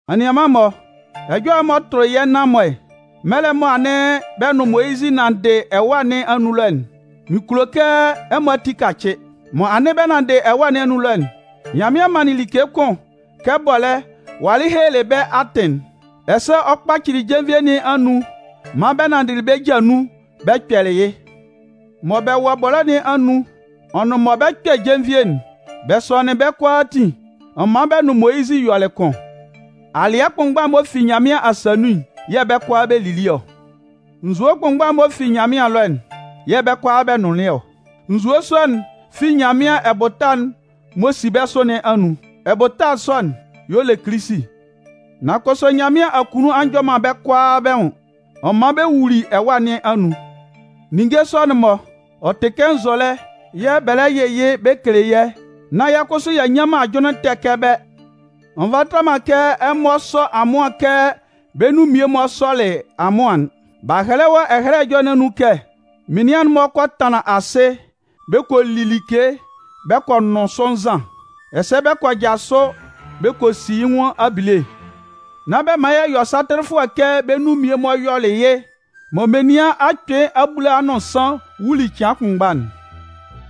Anianman-mɔ, ɛjɔlɛ m'ɔ tʋlɩ yɛ́ nan-mɔ mɛlɛ mɔ anɩn bɛ nʋn Moyizɩ nanndɩ ɛwâ nɩn anun ɛlɔ'n, mɩn kulo kɛ ɛmɔ ati kacɩ. Mɔ anɩn bɛ nanndɩ ɛwâ nɩn anun ɛlɔ'n, Nyanmɩan manlɩn like kʋn kɛ bɔlɛ́ walɩ helelɩ bɛ́ atɩn'n, ɛsɛ ɔ kpacɩlɩ jenvie nɩn anun maan bɛ nanndɩ bɛ́ ja nun bɛ kpɛlɩ yɩ́. Mɔ bɛ wɔ bɔlɛ́ nɩn anun ɔ nʋn mɔ bɛ 'kpɛ jenvie'n, bɛ sɔnɩnlɩn bɛ́ kʋalaatin ɔ man bɛ nʋn Moyizɩ yɔlɩ kʋn. Alɩɛ kʋnmgba'n m'ɔ fi Nyanmɩan asa nun'n yɛ̂ bɛ́ kʋalaa bɛ lili ɔ. Nzue kʋnmgba'n m'ɔ fi Nyanmɩan ɛlɔ'n yɛ̂ bɛ́ kʋalaa bɛ nʋnlɩn ɔ. Nzue sɔ'n fi Nyanmɩan ɛbʋta'n m'ɔ si bɛ́ sʋ nɩn anun. Ɛbʋta sɔ'n y'ɔ le Kilisi. Nan kʋsʋ Nyanmɩan akunnun a njɔ man bɛ́ kʋalaa bɛ́ nwʋn. Ɔ man bɛ wuli ɛwa nɩn anun. Ninnge sɔ'n-mɔ, ɔ tɩ kɛ nzɔlɛ yɛ̂ bɛ lɛ yɩ yɩ́ bɛ kele yɛ́, nán yɛ́ kʋsʋ y'a nnyan man ajʋnlɩn ɛtɛ kɛ bɛ́. Ɔ nvata man kɛ ɛmɔ sɔ amʋan kɛ bɛ́ nun mmie-mɔ sɔlɩ amʋan'n. B'a hɛlɛ wɔ Ɛhɛlɛ Ɛjɔlɛ nɩn anun kɛ: Menian'n-mɔ kɔ tanlan asɩ bɛ kɔ li like bɛ kɔ nʋn sʋ nzan. Ɛsɛ bɛ kɔ jasʋ bɛ kɔ si yɩ́ nwʋn abile. Nán bɛ man yɛ yɔ satɩlɩfʋɛ kɛ bɛ́ nun mmie-mɔ yɔlɩ yɩ́ mɔ menian akpɩɩ abulaa nʋn nsan wuli cɩan kʋnmgba'n.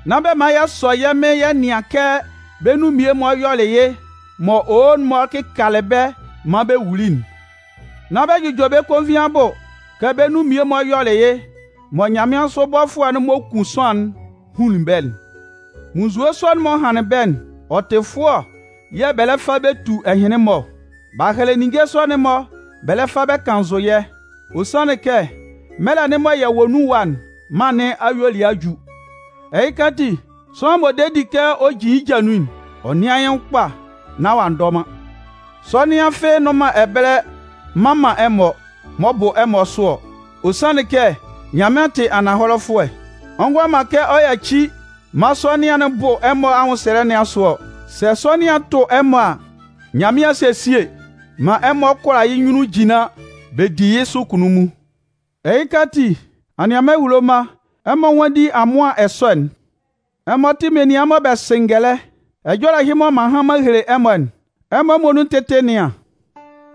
Nán bɛ man yɛ sɔ yɛ́ Mɩn yɛ nɩan kɛ bɛ́ nun mmie-mɔ yɔlɩ yɩ́ mɔ owo-mɔ kɩkalɩ bɛ́ maan bɛ wuli'n. Nán bɛ jʋjɔ bɛ́ konvin abʋ, kɛ bɛ́ nun mmie-mɔ yɔlɩ yɩ́ mɔ nyanmɩansʋ bɔfʋɛ'n m'ɔ kun sʋanlan'n hunlin bɛ́'n. Munnzue sɔ'n m'ɔ hanlɩn bɛ́'n, ɔ tɩ fʋɔ yɛ̂ bɛ lɛ fa bɛ tu ɛhɩnlɩn-mɔ ɔ. B'a hɛlɛ ninnge sɔ'n bɛ lɛ fa bɛ kannzʋ yɛ́, ɔ sanlɩn kɛ mɛlɛ'n mɔ yɛ wɔ nun ɛwa'n, mân nɩn ayuelɩɛ a ju. Ɛhɩka ati, sʋanlan m'ɔ de di kɛ ɔ jin yɩ́ ja nun'n, ɔ nɩ́an yɩ́ nwʋn kpa nán ɔ'a ndɔ man. Sɔnɩan fɩ́ɩ́ nnʋn man ɛbɛlɛ mman man ɛmɔ m'ɔ bʋ ɛmɔ sʋ ɔ. Ɔ sanlɩn kɛ Nyanmɩan tɩ ananhɔlɛfʋɛ. Ɔ ngʋala man kɛ ɔ yaci maan sɔnɩan'n bʋ ɛmɔ anwʋnsɛlɛ nɩn asʋ ɔ. Sɛ sɔnɩan'n tʋ ɛmɔ a, Nyanmɩan 'sesie maan ɛmɔ kʋala yɩ́ nyunnun jinlan bɛ di yɩ́ sʋ kunnunmun. Ɛhɩka ati, anianman ehulo mma, ɛmɔ nwánndi amʋan ɛsɔ'n. Ɛmɔ tɩ menian mɔ bɛ sɩ ngɛlɛ, ɛjɔlɛ ɛhɩ mɔ m'an han m'an hele ɛmɔ'n, ɛmɔ muonun tɩ́tɩ nɩ́an.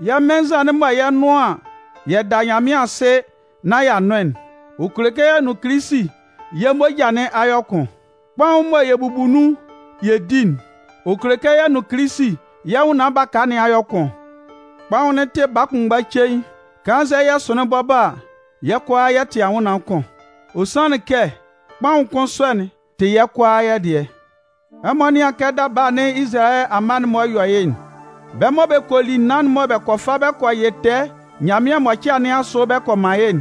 Yɛ́ Mɩn nzan'n mɔ yɛ 'nʋn an yɛ da Nyanmɩan asɩ nán y'a nʋn'n, ɔ kele kɛ yɛ nʋn Kilisi yɛ́ moja nɩn a yɔ kʋn. Kpaʋn'n mɔ yɛ bubu nun yɛ di'n, ɔ kele kɛ yɛ nʋn Kilisi yɛ́ sʋanlan baka nɩn a yɔ kʋn. Kpaʋn'n tɩ baa kʋnmgba cein. Kannzɛ yɛ sʋnlɩn bɔbɔ a, yɛ́ kʋalaa yɛ tɩ anwʋnnaan kʋn. Ɔ sanlɩn kɛ kpaʋn kʋn sɔ'n tɩ yɛ́ kʋalaa yɛ́ dɩɛ. Ɛmɔ nɩ́an kɛ daba anɩn Izalayɛ amma'n-mɔ yɔ yɩ́'n. Bɛ́ mɔ bɛ kɔ li naan'n mɔ bɛ kɔ fa bɛ kɔ yɩ tɛɛ Nyanmɩan mʋcɩa nɩn asʋ bɛ kɔ man yɩ́'n,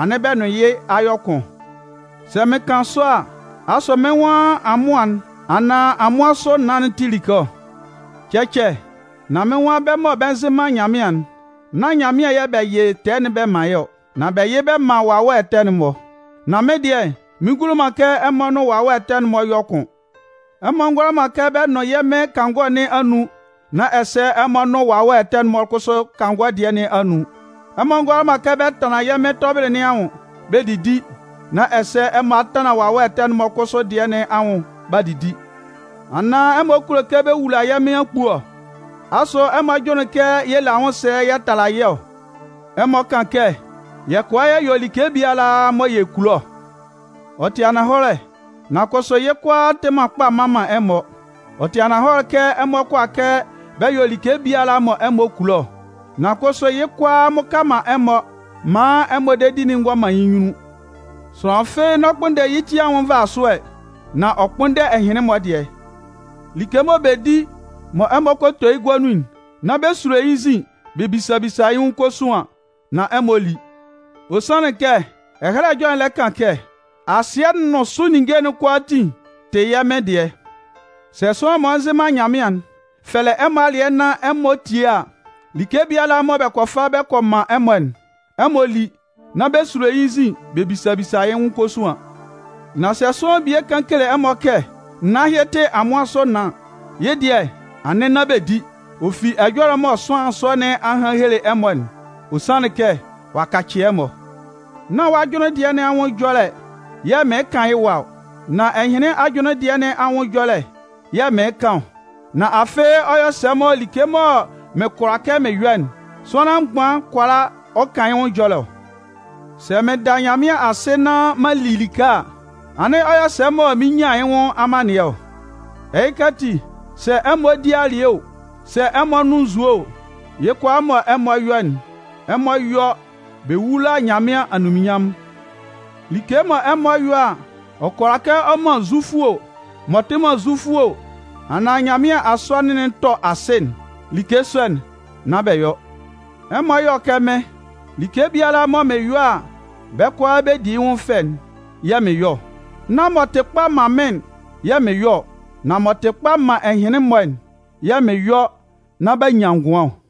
anɩn bɛ nʋn yɩ́ a yɔ kʋn. Sɛ mɩn kan sɔ a, asʋ mɩ́n nwan amʋan'n anaan amʋan sʋ naan'n tɩ like ɔ? Cɛcɛ! Nan mɩ́n nwan bɛ́ mɔ bɛ nzɩ man Nyanmɩan'n, nán Nyanmɩan yɛ bɛ yɩ bɛ́ tɛɛ'n bɛ man yɩ́ ɔ, nan bɛ yɩ bɛ man wawɛ ɛtɛ'n-mɔ. Nan mɩ́n dɩɛ mɩn ngulo man kɛ ɛmɔ nʋn wawɛ ɛtɛ'n-mɔ yɔ kʋn. Ɛmɔ ngʋala man kɛ bɛ nʋn yɛ́ Mɩn kangɔ nɩn anun nán ɛsɛ ɛmɔ a nʋn wawɛ ɛtɛ'n-mɔ kʋsʋ kangɔ dɩɛ nɩn anun. Ɛmɔ ngʋala man kɛ bɛ tanlan yɛ́ Mɩn tɔbɩlɩ nɩn anwʋn bɛ didi nán ɛsɛ ɛmɔ a tanlan wawɛ ɛtɛ'n-mɔ kʋsʋ dɩɛ nɩn anwʋn b'a didi. Anaan ɛmɔ kulo kɛ bɛ wula yɛ́ Mɩn akpue ɔ? Asʋ ɛmɔ jʋnlɩn kɛ yɛ le anwʋnsɛlɛ yɛ tala yɩ́ ɔ? Ɛmɔ kan kɛ: “Yɛ kʋala yɛ yɔ like biala mɔ yɛ kulo ɔ.” Ɔ tɩ ananhɔlɛ, nan kʋsʋ yɩ́ kʋalaa tɩ man kpa mman man ɛmɔ. Ɔ tɩ ananhɔlɛ kɛ ɛmɔ kʋala kɛ bɛ yɔ like biala mɔ ɛmɔ kulo ɔ, nan kʋsʋ yɩ́ kʋalaa mmʋka man ɛmɔ maan ɛmɔ dedi'n ngɔ man yɩ́ nyunnun. Sʋanlan fɩ́ɩ́ n'ɔ kpʋnndɛ yɩ́ ti anwʋn nvasʋɛ, nan ɔ kpʋ́nndɛ ɛhɩnlɩn-mɔ dɩɛ. Like mɔ bɛ di, mɔ ɛmɔ kɔ to yɩ́ gua nun'n, nán bɛ sulo yɩ́ nzin bɛ bisa bisa yɩ́ nwʋn kosuan nán ɛmɔ lí. Ɔ sanlɩn kɛ Ɛhɛlɛ Ɛjɔlɛ'n lɛ kan kɛ: Asɩɛ'n nʋn sʋ ninnge'n kʋalaatin tɩ yɛ́ Mɩn dɩɛ. Sɛ sʋanlan m'ɔ nzɩ man Nyanmɩan'n fɛlɛ ɛmɔ alɩɛ nán ɛmɔ tie a, like biala mɔ bɛ kɔ fa bɛ kɔ man ɛmɔ'n, ɛmɔ lí, nán bɛ sulo yɩ́ nzin bɛ bisa bisa yɩ́ nwʋn kosuan. Nan sɛ sʋanlan bie kan kele ɛmɔ kɛ: “Naan ɛhɩ tɩ amʋan sʋ naan,” yɩ́ dɩɛ anɩn nán bɛ di, ɔ fi ɛjɔlɛ'n mɔ sʋanlan sɔ nɩn a han a hele ɛmɔ'n. Ɔ sanlɩn kɛ ɔ'a kacɩ ɛmɔ. Nán wɔ́ ajʋnlɩn dɩɛ nɩn anwʋn ɛjɔlɛ yɛ̂ mɩɩn kan yɩ́ ɛwa ɔ, nan ɛhɩnlɩn ajʋnlɩn dɩɛ nɩn anwʋn ɛjɔlɛ yɛ̂ mɩɩn kan ɔ. Nan afɩ ɔ yɔ sɛ mɔ like mɔ mɩn kʋala kɛ mɩn yɔ'n, sʋanlan mgban kʋala ɔ kan yɩ́ nwʋn ɛjɔlɛ ɔ? Sɛ mɩn da Nyanmɩan asɩ nán m'an li like a, anɩn ɔ yɔ sɛ mɔ mɩn nyan yɩ́ nwʋn amannɩɛ ɔ? Ɛhɩka ati, sɛ ɛmɔ 'di alɩɛ o, sɛ ɛmɔ 'nʋn nzue o, yɩ́ kʋalaa mɔ ɛmɔ 'yɔ'n, ɛmɔ yɔ́ bɛ wúla Nyanmɩan anunminnyanmʋn. Like mɔ ɛmɔ yɔ a, ɔ kʋala kɛ ɔ man Zufʋ o, m'ɔ tɩ man Zufʋ o, anaan Nyanmɩan asɔnɩn'n tɔ asɩ'n, like sɔ'n, nán bɛ yɔ. Ɛmɔ yɔ́ kɛ mɩ́n. Like biala mɔ mɩn yɔ a bɛ́ kʋalaa bɛ di yɩ́ nwʋn fɛ'n yɛ̂ mɩn yɔ ɔ. Nán m'ɔ tɩ kpa man mɩ́n'n yɛ̂ mɩn yɔ ɔ, nan m'ɔ tɩ kpa man ɛhɩnlɩn-mɔ'n yɛ̂ mɩn yɔ nán b'a nyan ngʋan ɔ.